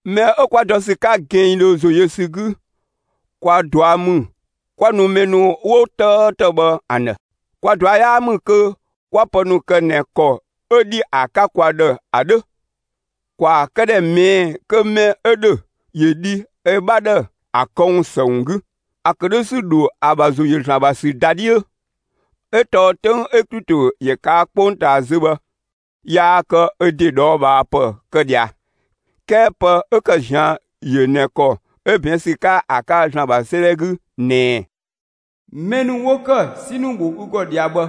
Mɛ 'ö 'kwa dɔ ‑sü 'ka gɛnngdhö ‑zo yö ‑sü 'gü, kwa ꞊dua' ‑mü 'kwa nu mɛ ‑nu 'ö 'wo 'tëëtë bhë ‑an ‑dhë. Kwa ꞊dua' 'yaa ‑mü kö 'kwa pë ‑nu kë ꞊nɛ ‑kɔ 'ö ‑dhi ‑a 'ka kwa ‑dhë ‑a 'dhö. ‑Kwaa këdhɛ ꞊mɛɛ'‑ kö mɛ 'ö ‑dhö ‑yö dhi ö 'bha ‑dhë ‑a këwun ‑së ‑wun 'gü; ‑a ‑kë 'dhö ‑sü ‑dho ‑a ‑bha ‑zo ‑yö ‑Zlan ‑bha ‑sü ‑dhö ‑da 'dhiö. 'Ö tɔɔ 'töng 'ö Klito ‑yö ꞊kaa' 'kpongtaa zö bhë yaa kë ö ‑de ꞊dhɔɔbhaapë kë ꞊dhia. 'Kɛɛ pë 'ö ‑kë ꞊zian' yö ꞊nɛ ‑kɔ 'ö ꞊bɛɛn' ‑sü 'ka ‑a 'ka ‑Zlan ‑bha 'sëëdhɛ 'gü ꞊nɛ: Mɛ ‑nu 'wo ‑kë 'si ‑nu ‑bho ü ‑gɔ ꞊dhia bhë,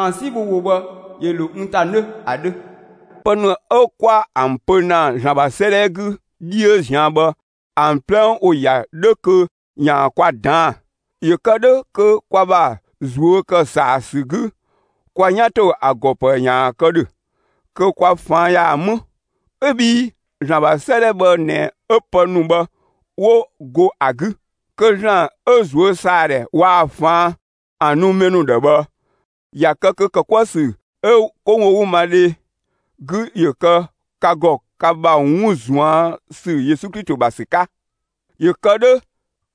‑an 'si ‑nu bho ‑wo bhë, ‑yö ‑lo n ‑ta 'nö ‑a 'dhö. Pë ‑nu 'ö 'kwa ‑an pö ‑na ‑Zlan ‑bha 'sëëdhɛ 'gü 'dhiö ꞊zian' bhë, ‑an 'plɛ ‑wo ‑ya 'dhö kö ‑yaan kwa ꞊daan'‑, ‑yö kë 'dhö kö kwa ‑bha ꞊zuö' ‑kë ‑saa ‑sü 'gü, kwa 'yan ‑to ‑a ‑gɔ ‑pë ‑yaan kë ‑dhö, kö kwa ꞊faan' ‑yaan 'më. ('Ö bhii ‑Zlan ‑bha 'sëëdhɛ bhë ꞊nɛ 'ö pë ‑nu bhë 'wo go ‑a 'gü.) Kö ‑Zlan 'ö ꞊zuösaadhɛ waa‑ ꞊faan' ‑an nu mɛ ‑nu ‑dhë bhë, ‑ya ‑kë kö ‑kë 'kuë‑ ‑sü 'ö 'kowogümadhe 'gü ‑yö kë ka ‑gɔ ka ‑bha 'wun ꞊zuan' ‑sü Yesu Klito ‑bha ‑sü 'ka. ‑Yö kë 'dhö,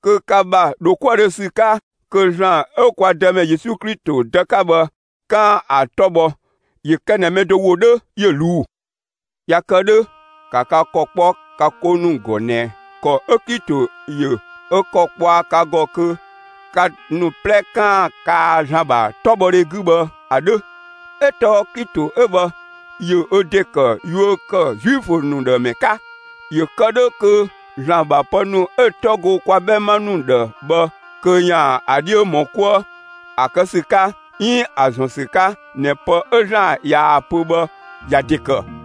kö ka ‑bha ‑dho 'kuëdhö ‑sü 'ka, kö ‑Zlan 'ö kwa Dëmɛ Yesu Klito Dë 'ka bhë, 'kaan‑ ‑a 'tɔ bhɔ; ‑yö kë ꞊nɛ mɛ do ‑wo 'dhö ‑yö ꞊luu'‑. ꞊Ya kë 'dhö, ‑ka ka ‑kɔ 'kpɔ ka 'ko ‑nu ‑gɔ ꞊nɛ ‑kɔ 'ö Klito ‑yö ö ‑kɔ kpɔa ka ‑gɔ kö ka ‑nu 'plɛ 'kaan‑ kaa ‑Zlan ‑bha 'tɔbhɔdhe 'gü bhë ‑a 'dhö. 'Ö tɔɔ Klito 'ö bhë ‑yö ö ‑de ‑kë yuö ‑kë Zuifö ‑nu ‑dhë ‑mɛ 'ka, ‑yö kë 'dhö kö ‑Zlan ‑bha pë ‑nu 'ö‑ 'tɔ go kwa 'bhɛma ‑nu ꞊va ‑dhë bhë kö ‑yaan ‑a 'dhiö ‑mɔ 'kuë ‑a kë ‑sü 'ka 'iin ‑a ‑zɔn ‑sü 'ka ꞊nɛ pë 'ö ‑Zlan ꞊yaa‑ pö bhë, ‑ya ‑de ‑kë.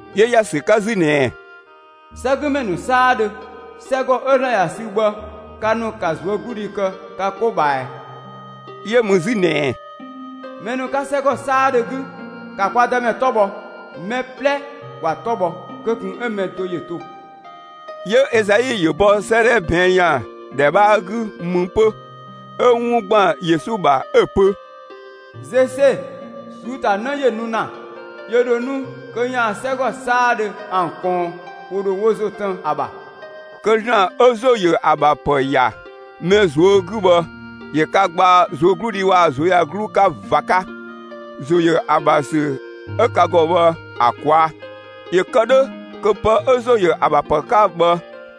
'Yö ‑ya ‑sü 'ka 'zü ꞊nɛ: 'Sɛgümɛ ‑nu 'saadhö, 'sɛgɔ 'ö ‑Zlan ‑ya sü bhë, ka ‑nu ‑ka ꞊zuögludhi kë ka 'ko ꞊bhaa ꞊ɛɛ! 'Yö mü 'zü ꞊nɛ: Mɛ ‑nu 'ka 'sɛgɔ 'saadhö 'gü, ‑ka kwa Dëmɛ 'tɔ bhɔ. Mɛ 'plɛ ‑wa 'tɔ bhɔ; (kö ꞊kun 'ö mɛ do ‑yö to)! 'Yö Ezai ‑yö bɔ 'sëëdhɛ ꞊bɛɛn' ‑yan ‑dhɛ 'bhaa 'gü mü 'pö ('ö 'wun ‑gban Yesu ‑bha) 'ö‑ pö: Zese ꞊suu'‑ ‑ta 'në ‑yö nu ‑na; ‑yö ‑dho nu kö ‑yaan 'sɛgɔ 'saadhö ‑an ꞊kɔɔn. ‑Wo ‑dho wo ‑zo 'tën ‑a ‑bha. Kö ‑Zlan 'ö ‑zo ‑yö ‑a ‑bha ‑pë ‑ya mɛ ꞊zuö' 'gü bhë, ‑yö ka gbaa ꞊zuögludhi waa‑ ꞊zuöyagluu 'ka (꞊va 'ka) ‑zo ‑yö ‑a ‑bha ‑sü 'ö ka ‑gɔ bhë ‑a ꞊kwaa', ‑yö kë 'dhö kö pë 'ö ‑zo ‑yö ‑a ‑bha ‑pë 'ka bhë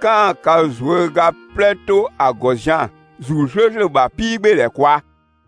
'kaan‑ ka ꞊zuöga 'plɛ 'to ‑a ‑gɔ zian‑ ‑Zuu 'slööslö ‑bha 'piigbeedhɛ ꞊kwaa'.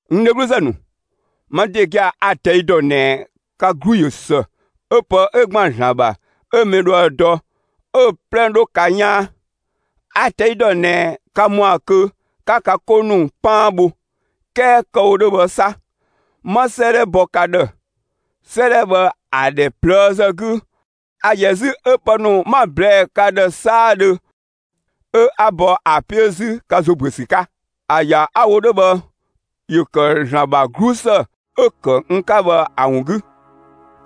N dhegluzë ‑nu, ma ‑de gia‑ a‑ ꞊tɛi' ‑dɔ ꞊nɛ ka 'glu ꞊yö ‑së 'ö pë 'ö ‑gban ‑Zlan ‑bha 'ö mɛ dhoë‑ dɔ, 'ö‑ 'plɛ 'dhö ka 'yaan. A‑ ꞊tɛi' dɔ ꞊nɛ ka ‑mɔa kö 'ka ka 'ko ‑nu 'paan bho. 'Kɛɛ kë‑ wo 'dhö bhë 'sa, 'ma 'sëëdhɛ bɔ ka ‑dhë. 'Sëëdhɛ bhë ‑a ‑dhɛ ꞊plëëzë 'gü, a ‑yɛ 'zü 'ö pë ‑nu 'ma‑ ꞊blɛɛ'‑ ka ‑dhë 'saadhö 'ö 'a bɔ ‑a 'piö 'zü ka ‑zo ‑büö ‑sü 'ka. ‑A ‑ya 'a‑ wo 'dhö bhë, ‑yö ‑kë ‑Zlan ‑bha 'glusë 'ö‑ kë n 'ka bhë ‑a ‑wun 'gü.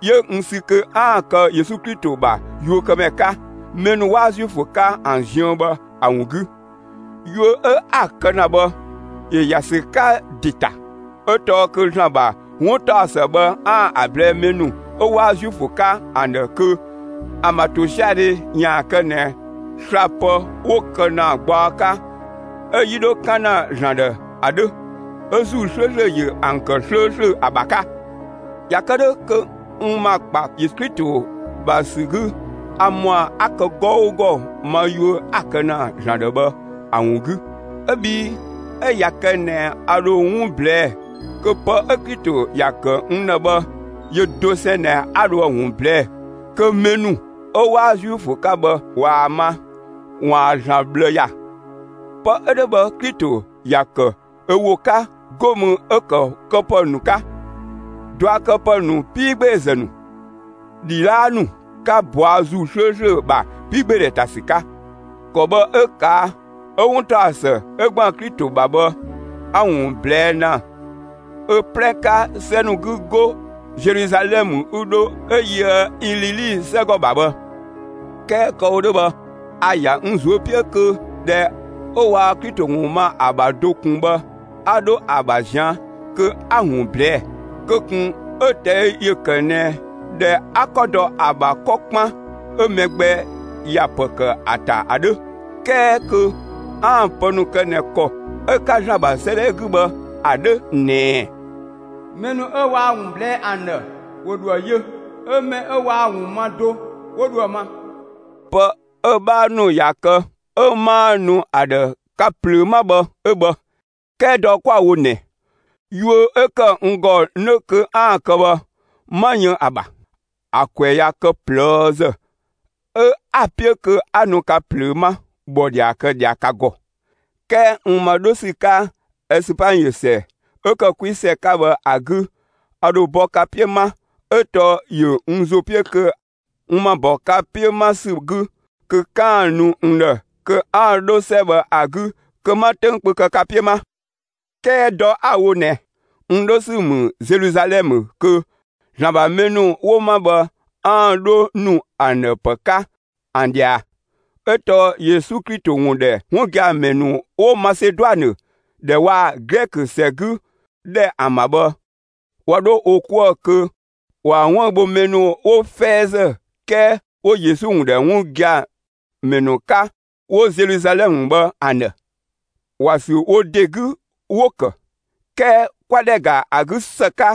'Yö n sü kö 'aan‑ kë Yesu Klito ‑bha yuökëmɛ 'ka, mɛ ‑nu 'waa Zuifö 'ka ‑an ziën bhë ‑a ‑wun 'gü. Yuö 'ö 'a‑ kë ‑na bhë, ‑yö ‑ya ‑sü 'ka ‑de ‑ta; 'ö tɔɔ kö ‑Zlan ‑bha 'wuntaɔsë bhë 'aan‑ ‑a ꞊blɛɛ'‑ mɛ ‑nu 'ö 'waa Zuifö 'ka ‑an ‑dhë kö ‑an ‑bha ‑tosiadhe ‑yaan kë ꞊nɛ slapë 'wo‑ kë ‑na gbaɔ 'ka 'ö‑ 'yi dho 'kan ‑na ‑Zlan ‑dhë ‑a 'dhö. 'Ö ‑Zuu 'slööslö ‑yö ‑an ‑kë 'slööslö ‑a ‑bha 'ka. ꞊Ya kë 'dhö kö n ‑ma ‑kpa Yesu Klito ‑bha ‑sü 'gü, a ‑mɔa 'a ‑kë 'gɔugɔ ma yuö 'a‑ kë ‑na ‑Zlan ‑dhë bhë ‑a ‑wun 'gü. 'Ö bhii 'ö ꞊ya kë ꞊nɛ 'a dho 'wun ꞊blɛɛ'‑, kö pë 'ö Klito ‑ya ‑kë n ‑dhë bhë, yö dosɛn ꞊nɛ 'a dhoë‑ ‑wun ꞊blɛɛ'‑ kö mɛ ‑nu 'ö 'waa Zuifö 'ka bhë ꞊waa‑ ma, ‑waan ‑Zlan ꞊bhlë ‑ya. Pë 'ö 'dhö bhë, Klito ‑ya ‑kë ö ‑wo 'ka, 'go mü 'ö‑ ‑kë këpë ‑nu 'ka, ꞊duakëpë ‑nu 'piigbeezë ‑nu, ‑dhidhaapë ‑nu 'ka ꞊bɔa' ‑Zuu 'slööslö ‑bha 'piigbeedhɛ ‑ta ‑sü 'ka. ‑Kɔ bhë 'ö ꞊kaa' 'ö 'wuntaɔsë 'ö ‑gban Klito ‑bha bhë, 'a‑ ‑wun ꞊blɛɛ' ‑na ö 'plɛ 'ka 'sɛ ‑nu 'gü 'go Zeluzalɛmë 'ö 'dho 'ö yöë Ilili 'sɛgɔ ‑bha bhë. 'Kɛɛ kë‑ wo 'dhö bhë, a‑ ‑ya n ꞊zuö' 'piö kö ꞊dhɛ 'ö waa Klito ‑wun ma ‑a ‑bha do ꞊kun bhë 'a 'dho ‑a ‑bha ꞊zian' kö 'a‑ ‑wun ꞊blɛɛ'‑, kö ꞊kun 'ö‑ ꞊tɛi' ‑yö kë ꞊nɛ ꞊dhɛ 'a 'kɔ dɔ ‑a ‑bha 'kɔ 'kpan 'ö mɛ gbɛ ‑ya ‑pë ‑kë ‑a ‑ta ‑a 'dhö. 'Kɛɛ kö 'aan‑ pë ‑nu kë ꞊nɛ ‑kɔ 'ö‑ 'ka ‑Zlan ‑bha 'sëëdhɛ 'gü bhë ‑a 'dhö ꞊nɛ: Mɛ ‑nu 'ö waa‑ ‑wun ꞊blɛɛ'‑ ‑an ‑dhë, ‑wo ‑dhoë yö, 'ö mɛ 'ö waa‑ ‑wun ma do, 'wo dhoë‑ ma. Pë 'ö‑ 'bhaa ‑nu ꞊ya kë 'ö 'maa nu ‑a ‑dhë ka ꞊plöö 'ma bhë 'ö bhë. 'Kɛɛ dɔ 'kwa‑ wo ꞊nɛ, yuö 'ö ‑kë n ‑gɔ 'nö kö 'aan‑ kë bhë, 'ma yën ‑a ‑bha. ‑A ‑kwɛ ꞊ya kë ꞊plëëzë 'ö 'a‑ 'piö kö 'a nu ka plöö 'ma ‑bhɔdhia kë ꞊dhia ka ‑gɔ. 'Kɛɛ n ‑ma 'dho ‑sü 'ka Ɛsüpanyiö ‑sɛ ('ö ‑kë 'kwi ‑sɛ 'ka bhë ‑a) 'gü, a ‑dho bɔ ka 'piö 'ma; 'ö tɔɔ ‑yö n ‑zo 'piö kö n ‑ma ‑bɔ ka 'piö 'ma ‑sü 'gü, kö 'kaan‑ nu n ‑dhë kö 'aan‑ 'dho 'sɛ bhë ‑a 'gü kö 'ma 'töng kpö kë ka 'piö 'ma. 'Kɛɛ dɔ 'a‑ wo ꞊nɛ n 'dho ‑sü ‑mü Zeluzalɛmë kö ‑Zlan ‑bha mɛ ‑nu 'wo 'ma bhë, 'aan‑ 'dho ‑nu ‑an ‑dhë pë 'ka ‑an ꞊dhia. 'Ö tɔɔ Yesu Klito ‑wun ‑dhɛ 'wun gia‑ ‑mɛ ‑nu 'wo Maseduanë ‑dhɛ waa‑ Glɛkö ‑sɛ 'gü ‑dhɛ ‑an ‑bha bhë, ꞊wa 'dho wo 'kuë‑ kö ‑waan 'wëü‑ bho mɛ ‑nu 'wo 'fɛɛzë 'kɛɛ 'wo Yesu ‑wun ‑dhɛ 'wun gia‑ ‑mɛ ‑nu 'ka, 'wo Zeluzalɛmë bhë ‑an ‑dhë. ‑Wa ‑sü wo ‑de 'gü 'wo‑ ‑kë. 'Kɛɛ 'kwa ‑dhɛ ‑ga ‑a 'gü ‑së 'ka,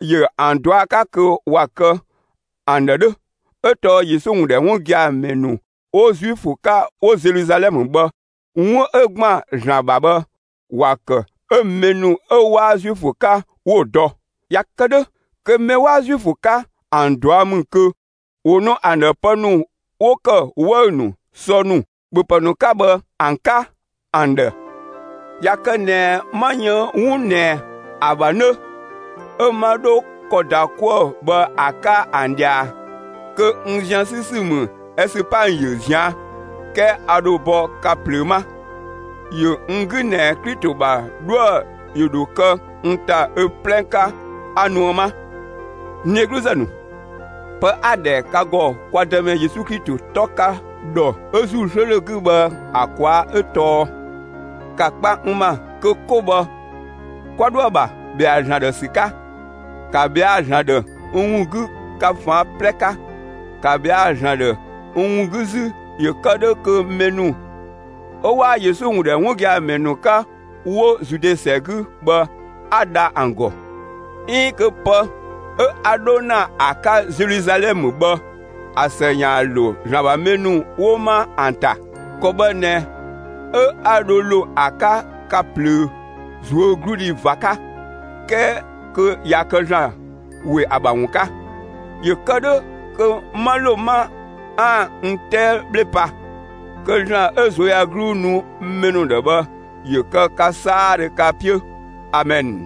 ‑yö ‑an ꞊dua' 'ka kö ‑wa kë ‑an ‑dhë 'dhö; 'ö tɔɔ Yesu ‑wun ‑dhɛ 'wun gia‑ ‑mɛ ‑nu 'wo Zuifö 'ka 'wo Zeluzalɛmë bhë, 'wun 'ö ‑gban ‑Zlan ‑bha bhë, ‑wa ‑kë 'ö mɛ ‑nu 'ö 'waa Zuifö 'ka 'wo‑ dɔ. ꞊Ya kë 'dhö kö mɛ 'waa Zuifö 'ka, ‑an ꞊dua' ‑mü kö ‑wo nu ‑an ‑dhë pë ‑nu 'wo ‑kë 'wëü‑ ‑nu, sɔ ‑nu, ‑bhöpë ‑nu 'ka bhë ‑an 'ka ‑an ‑dhë. ꞊Ya kë ꞊nɛ 'ma yën 'wun ꞊nɛ ‑a ‑bha 'nö, 'ö 'ma 'dho ‑kɔ ‑da 'kuë‑ bhë ‑a 'ka ‑an ꞊dhia, kö n zian 'sü ‑sü ‑mü Ɛsüpanyiö ꞊zian'; 'kɛɛ a ‑dho bɔ ka ꞊plöö 'ma. ‑Yö n 'gü ꞊nɛ Klito ‑bha 'dhuë‑ ‑yö ‑dho kë n ‑ta ö 'plɛ 'ka, 'a nuë 'ma. N dhegluzë ‑nu, pë 'a‑ ‑dhɛ ka ‑gɔ kwa Dëmɛ Yesu Klito 'tɔ 'ka ‑dhɔ 'ö ‑Zuu 'slööslö 'gü bhë ‑a ꞊kwaa' 'ö tɔɔ: ‑Ka kpa n ‑ma kö 'ko bhë, 'kwa 'dhoë‑ ‑bha ‑bhɛa ‑Zlan ‑dhë ‑sü 'ka; ‑ka ꞊bhɛa' ‑Zlan ‑dhë n ‑wun 'gü ka ꞊faan' 'plɛ 'ka. ‑Ka ꞊bhɛa' ‑Zlan ‑dhë n ‑wun 'gü 'zü ‑yö kë 'dhö kö mɛ ‑nu 'ö 'waa Yesu ‑wun ‑dhɛ 'wun gia‑ ‑mɛ ‑nu 'ka 'wo Zude ‑sɛ 'gü bhë 'a dha ‑an ‑gɔ, 'iin kö pë 'ö 'a 'dho ‑na ‑a 'ka Zeluzalɛmë bhë, ‑a ‑së ‑yaan ‑lo ‑Zlan ‑bha mɛ ‑nu 'wo ma ‑an ‑ta. ‑Kɔ bhë ꞊nɛ 'ö 'a dho ‑lo ‑a 'ka ka ꞊plöö ꞊zuögludhi ꞊va 'ka, 'kɛɛ kö ꞊ya kë ‑Zlan ‑we ‑a ‑bha ‑wun 'ka, ‑yö kë 'dhö kö 'ma ‑lo 'ma 'aan‑ n 'tɛɛ 'bhle pa. Kö ‑Zlan ö ꞊zuöyagluu nu mɛ ‑nu ‑dhë bhë, ‑yö kë ka 'saadhö ka 'piö! Amɛn.